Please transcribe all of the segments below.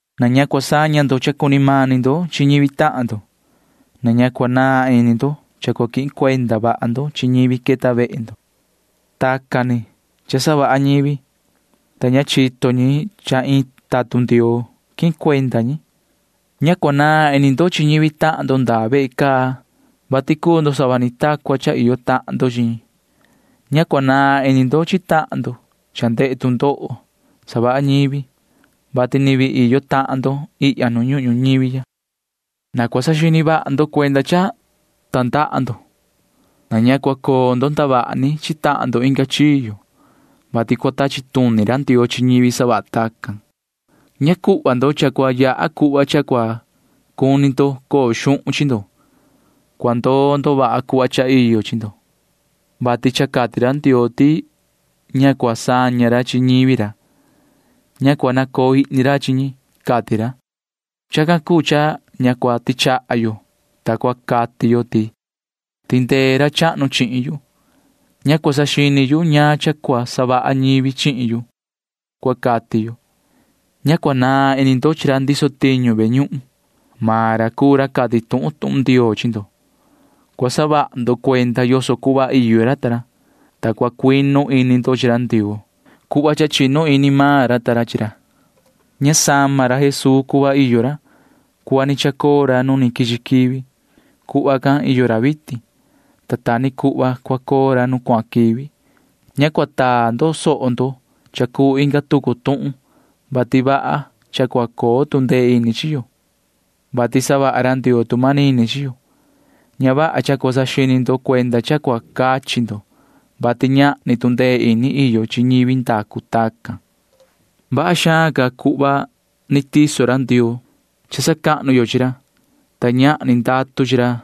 Na ña cua saña ndo cha cuni mani ndo chi ñivi tahan ndo. Na ña cua naan ini ndo cha cua quihin cuenda vaha ndo chi ñivi queta vehe ndo. Tacan ni cha savaha ñivi, ta ña chito ñi cha iin tatun Ndioo quihin cuenda ñi. Ña cua naan ini ndo chi ñivi tahan ndo ndaa ve caa, vati cuu ndo sava ni ta cua cha iyo tahan ndo chi ñi. Ña cua naan ini ndo chi tahan ndo cha ndehe tu ndoho savaha ñivi, vati ni vii iyo tahan ndo ihya nu ñuhun ñuñivi ya. Na cua saxini vaha ndo cuenda cha tandaha ndo. Na ña cua coo ndo ndavaha ni chi tahan ndo inga chiyo, vati cua tachi tuni ra Ndioo chi ñivi savaha tacan. Ña cuhva ndo cha cua yaha cuhva cha cua cuni ndo coo xuhun chi ndo. Cua ndoo ndo vaha cuhva cha iyo chi ndo, vati cha cati ra Ndioo ti ña cua saña ra chi ñivi ra. Ña cua nacoo ihni ra chi ñi, cati ra. Chacan cuu cha ña cua tichaha yo, ta cua cati yo ti: Tindee ra chahnu chihin yu. Ña cua saxini yu ñaan cha cua savaha ñivi chihin yu, cua cati yo. Ña cua naan ini ndo chi ra ndiso tiñu ve ñuhun. Maan ra cuu ra cati tuhun tuhun Ndioo chi ndo. Cua saha ndo cuenda yoso cuhva iyo ra ta ra, ta cua cuinu ini ndo chi ra Ndioo cuhva cha chinu ini maan ra ta ra chi ra. Ña sama ra Jesuu cuhva iyo ra. Cuhva ni chacoo ra nu ni quichi quivi―cuhva can iyo ra vitin, ta ta ni cuhva cua coo ra nu cuahan quivi. Ña cua taa ndo soho ndo cha cuu inga tucu tuhun, vati vaha cha cua coo tu ndee ini chi yo, vati savaha ra Ndioo tu manini chi yo. Ña vaha cha cua saxini ndo cuenda cha cua cachi ndo, vati ñahni tu ndee ini iyo chi ñivi ndacu tacan. Vaha xaan ca cuhva ni tiso ra Ndioo cha sacahnu yo chi ra, ta ñahni ndatu chi ra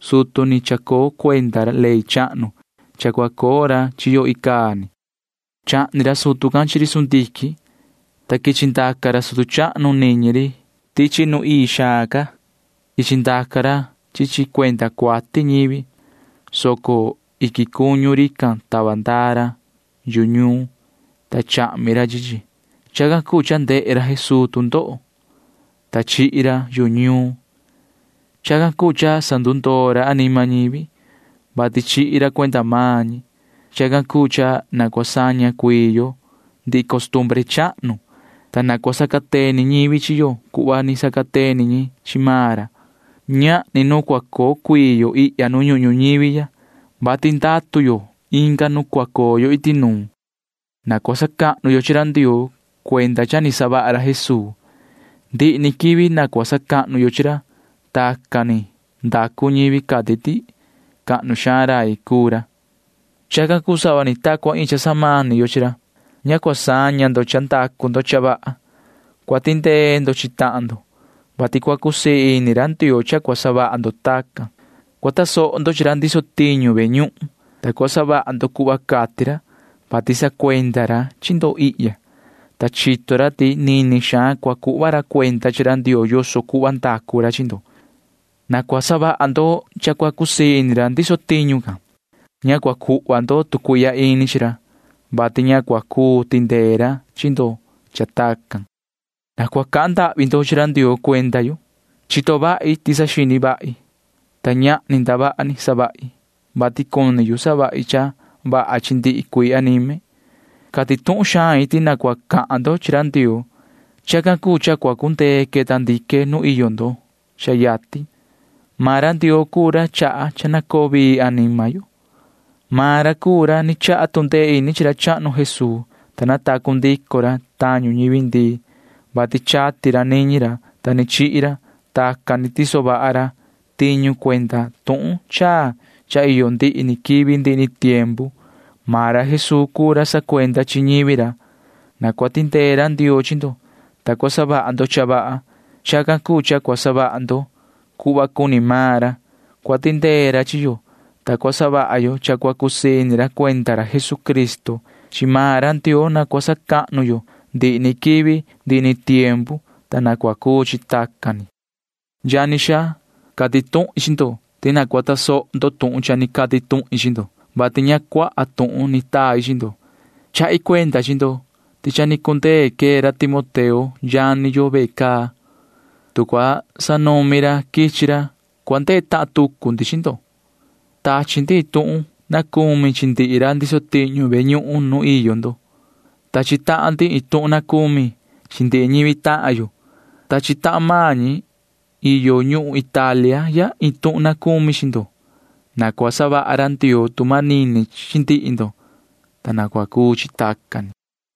sutu ni chacoo cuenda ley chahnu cha cua coo ra chi yo icaa ni. Chahni ra sutu can chi ri sundiquin, ta quichi ndaca ra sutu chahnu niñi ri tichi nu ii xaan ca. Quichi ndaca ra chi chi cuenda cuati ñivi, soco iquin cuñu rican tava ndaa ra yu ñuun, ta chahmi ra chi chi. Chacan cuu cha ndehe ra Jesuu tu ndoho, ta chihi ra yu ñuun. Chacan cuu cha sandundoo ra anima ñivi, vati chihi ra cuenda maan ñi. Chacan cuu cha na cua saña cuii yo ndihi costumbre chahnu, ta na cua sacateni ñivi chi yo cuhva ni sacateni ñi chi maan ra. Ñahni nu cua coo cuii yo ihya nu ñuhun ñuñivi ya, vati ndatu yo inga nu cua coo yo iti nuun. Na cua sacahnu yo chi ra Ndioo cuenda cha ni savaha ra Jesuu. Ndihi ni quivi na cua sacahnu yo chi ra. Tacan ni ndacu ñivi cati ti cahnu xaan rai cuu ra. [Chacan cuu sava ni ta cua iin cha samani yo chi ra.] Ña cua saña ndo cha ndacu ndo cha vaha. Cua tindee ndo chi tahan ndo, vati cua cusii ini ra Ndioo cha cua savaha ndo tacan. Cua tasoho ndo chi ra ndiso tiñu ve ñuhun, ta cua savaha ndo cuhva cati ra, vati sacuenda ra chi ndo ihya, ta chito ra ti nini xaan cua cuhva ra cuenda chi ra Ndioo yoso cuhva ndacu ra chi ndo. Na cua savaha ndo cha cua cusii ini ra ndiso tiñu can. Ña cua cuhva ndo tu cuihya ini chi ra, vati ña cua cuu tindee ra chi ndo cha tacan. Na cua cahan ndahvi ndo chi ra Ndioo cuenda yu. Chito vahi ti saxini vahi, ta ñahni ndavaha ni savahi, vati cuni yu savahi cha vaha chi ndihi cuii anime. Cati tuhun xain ti na cua cahan ndo chi ra Ndioo. Chacan cuu cha cua cundee queta ndique nu iyo ndo cha yatin. Maan ra Ndioo cuu ra chaha cha na coo vii anima yo. Maan ra cuu ra ni chaha tu ndee ini chi ra chahnu Jesuu, ta natacu ndico ra tañu ñivi ndii, vati chati ra niñi ra, ta ni chihi ra. Tacan ni tiso vaha ra tiñu cuenda tuhun chaa cha iyo ndihi ni quivi ndihi ni tiempu. Maan ra Jesuu cuu ra sacuenda chi ñivi ra. Na cua tindee ra Ndioo chi ndo, ta cua savaha ndo cha vaha. Chacan cuu cha cua savaha ndo cuhva cuni maan ra. Cua tindee ra chi yo, ta cua savaha yo cha cua cusii ini ra cuenda ra Jesucristo. Chi maan ra Ndioo na cua sacahnu yo ndihi ni quivi ndihi ni tiempu, ta na cua cuu chi tacan ni. Yani xaa, cati tuhin chi ndo ti na cua tasoho ndo tuhun cha ni cati tuhin chi ndo, vati ña cuaha tuhun ni tai chi ndo. Chahi cuenda chi ndo ti cha ni cundee quee ra Timoteo yani yo ve caa. Tu cua sanumi ra quichi ra, cua ndehe tahan tucu ndi chi ndo. Tachi ndi iin tuhun na cumi chi ndihi ra ndiso tiñu ve ñuhun nu iyo ndo. Tachi tahan ndi iin tuhun na cumi chi ndihi ñivi tahan yo. Tachi tahan maan ñi iyo ñuhun Italia ya iin tuhun na cumi chi ndo. Na cua savaha ra Ndioo tu manini chi ndihi ndo, ta na cua cuu chi tacan ni.